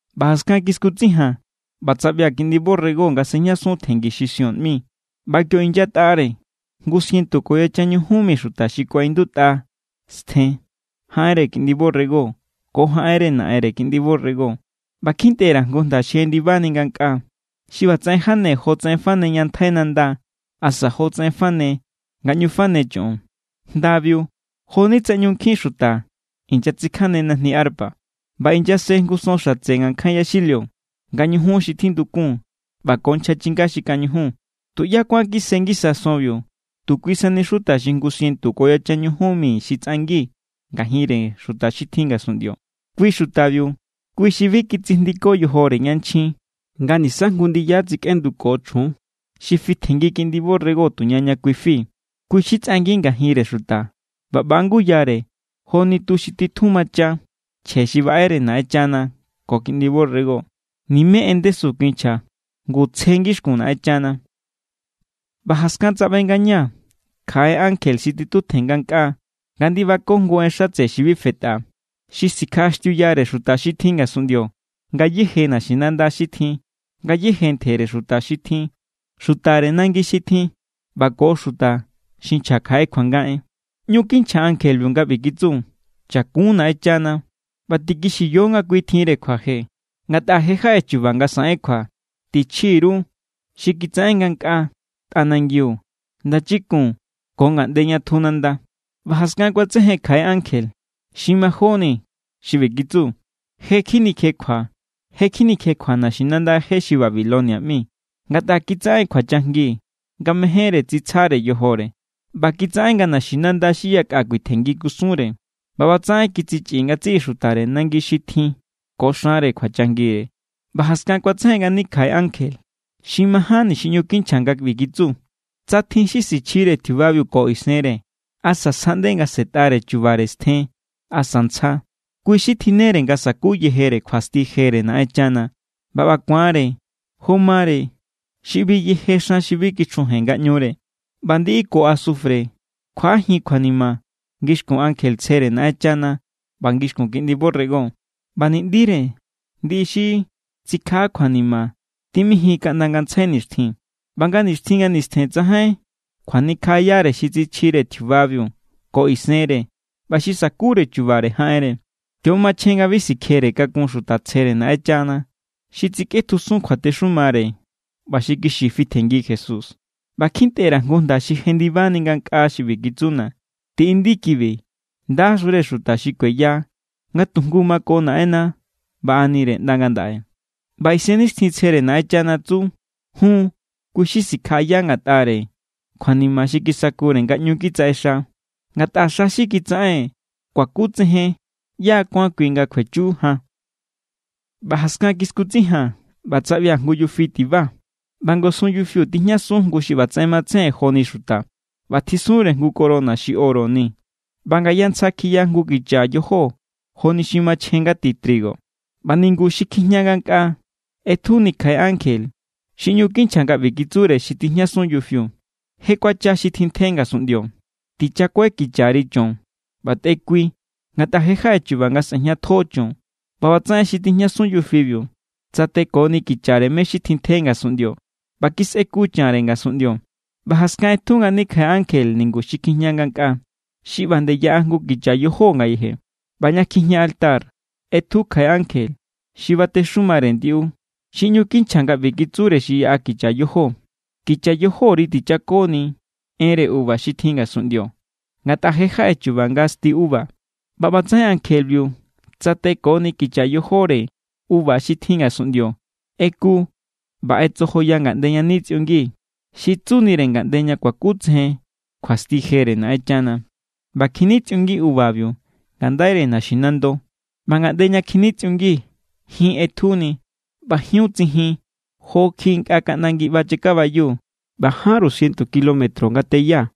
ꞌBa jaskan kiskutsijaa̱n ꞌba tsaꞌbia̱ Kiꞌndi borrego nga sejñasun tjengi xi Sión ꞌmi. ꞌBa kio inyatꞌare jngu sientu ko yachan ñujun mi xuta xi kuaꞌindutꞌa stjen jaꞌenre Kiꞌndi borrego ko jaꞌenre Naꞌenre Kiꞌndi borrego. ꞌBa kjintꞌe_ra̱ jngu jnda xi jendibani ngankꞌaa, xi ꞌbatsaꞌen jane jotsaꞌen fane ña ntjai nanda asa jotsaꞌen fane nga ꞌñu fane choꞌon. Jndabiu jo=ni tsa ꞌñu nkjin xuta inyatsikjane najni arpa. ꞌBa inyase jngu son xatse ngankjain yaxilio, nga ñujun xi tjindukun ꞌba ko nchja chinga xi kañujun. Tuꞌyá kuán kise ngisa sonbiu, tu kui sani xuta xi jngu sientu ko yachan ñujun mi xi tsꞌangi ngajinre xuta xi tjin ngasunꞌndio. Kui xutabiu kui xi bi kitsijndiko yojore yanchjin nga nisa jngu ndiyajín tsikꞌenduko chjun, xi fitjenngi Kiꞌndi borrego tuña ña kui fi. Kui xi tsꞌangi ngajinre xuta ꞌba ꞌba= nguyare joni tu xi tjun macha, chje xi baꞌere Naꞌenchana ko Kiꞌndi borrego. Nimé en ndesu kinchja, ngu tsje ngixkun Naꞌenchana. ꞌBa jaskan tsaꞌbe ngañaa̱ kjaꞌe ankje xi titutjen ngankꞌaa nga ndibako jngu en xatse xi bi fetꞌa. Xi sikjaꞌaxtiuyare xuta xi tjin ngasunꞌndio, ngayéje naxinanda xi tjin, ngayéje ntjere xuta xi tjin, xutare nangi xi tjin ꞌba ko xuta xi nchja kjaꞌe kjuanga en. ꞌÑu kinchja ankjebiu nga ꞌbi kitsu: “Chakun Naꞌenchana ꞌba tikixiyo nga kui tjinre kjuaje, ngatꞌa je= jaꞌe chu̱ba̱ nga saꞌen kjua. Tichji_ru xi kitsaꞌen ngankꞌaa, tꞌanangiu, ndachikun ko ngaꞌnde ña tju nanda.” ꞌBa jaskan kuatsejen kjaꞌe ankje, xi majóni, xi ꞌbi kitsu: “Je= kjinikjekjua, je= kjinikjekjua naxinanda je xi Babilonia ꞌmi, ngatꞌa kitsaꞌen kjuachajngi nga mejénre tsitsjare yojore. ꞌBa kitsaꞌen nga naxinanda xi yakꞌa kjuitjenngi kusunre. ꞌBa ꞌbatsaꞌen kitsichꞌi ngatsiꞌi xutare nangi xi tjin ko xanre kjuachajngire.” ꞌBa jaskan kuatsejen ngani kjaꞌe ankje. Xi majánni xi ꞌñu kinchja nga ꞌbi kitsu: “Tsa tjin xi sichjire tjiubabiu ko isenre, asa sjaꞌnde nga sꞌe̱tꞌare chubare stjen asa ntsja, kui xi tjinnere nga sa̱ku yejere kjuasti jere Naꞌenchana. ꞌBa ꞌba ku̱anre jo mare xi ꞌbi yeje xan xi bi kichjujen ngaꞌñure. ꞌBa ndiꞌi ko asufre kjuaꞌajin kjuanima ngixkun ankje tsjere Naꞌenchana ꞌba ngixkun Kiꞌndi borrego. ꞌBa ni̱ꞌndire ndiꞌi xi tsikjaꞌa kjuanima timijin kaꞌnda ngantsjai nixtjin. ꞌBa nga nixtjin nga nistjen tsajain kjuanikjaꞌayare xi tsichjire tjiubabiu ko isenre ꞌba xi sa̱kure chubare jaꞌenre.” Kio= machjen nga bi sikjere kakun xuta tsjere Naꞌenchana, xi tsikꞌetjusun kjuatexumare ꞌba xi kixi fitjenngi Jesús. ꞌBa kjintꞌe_ra̱ jngu jnda xi jendibani ngankꞌaa xi ꞌbi kitsuna̱: “Tiꞌindi kibi: ¡Ndaxure xuta xi kueya nga tujngu mako Naꞌenna baꞌanire ꞌnda ngandaꞌe!” ꞌBa Isennixtjintsjere Naꞌenchana tsu: “Jun. Kui xi sikjaꞌaya ngatꞌare kjuanima xi kisakure nga ꞌñu kitsaꞌexa. Ngatꞌa xa xi kitsaꞌen kuakutsejen ꞌyá= kuán kui nga kjuechu jan.” ꞌBa jaskan kiskutsijaa̱n ꞌba tsaꞌbia̱ jngu yufi tiba. ꞌBa ngasun yufiu tijñasun jngu xi ꞌbatsaꞌen matsejen joni xuta, ꞌba tjisunre jngu corona xi oro ni. ꞌBa ngaya ntsja kjiya jngu kicha yojó joni xi machjen nga ti trigo. ꞌBa ningu xi kjijña ngankꞌaa ꞌetjuni kjaꞌe ankje xi ꞌñu kinchja nga ꞌbi kitsure xi tijñasun yufiu: “Je kuacha xi tjintje ngasunꞌndio. Tichakuai kichari cho̱n ꞌba tꞌekui, ngatꞌa je= jaꞌe chu̱ba̱ nga sꞌe̱jñatjo cho̱n.” ꞌBa ꞌbatsaꞌen xi tijñasun yufiu tsateko kichare mé= xi tjintje ngasunꞌndio, ꞌba kisꞌeku chanre ngasunꞌndio. ꞌBa jaskan ꞌetju ngani kjaꞌe ankje ningu xi kjijña ngankꞌaa xi ꞌba nde yaꞌa jngu kicha yojó ngayeje. ꞌBa ña kjijña altar ꞌetju kjaꞌe ankje, xi batexumare ndiꞌu. Xi ꞌñu kinchja nga ꞌbi kitsure xi yaꞌa kicha yojó: “Kicha yojóri tichakoni enre uva xi tjin ngasunꞌndio, ngatꞌa je= jaꞌe chu̱ba̱ nga sti uva.” ꞌBa ꞌbatsaꞌen ankjebiu tsatekoni kicha yojóre uva xi tjin ngasunꞌndio, ꞌeku ꞌba ꞌetsojoya ngaꞌnde ña nitsꞌiungi, xi tsunire ngaꞌnde ña kuakutsejen kjuasti jere Naꞌenchana. ꞌBa kjinitsꞌiungi uvabiu ngandaire naxinando. ꞌBa ngaꞌnde ña kjinitsꞌiungi, jin ꞌetjuni. ꞌBa jiun tsijin jo kjiꞌi nkꞌa kaꞌnda ngiꞌba chakabayu, ꞌba jánru sientu kilómetro nga teya.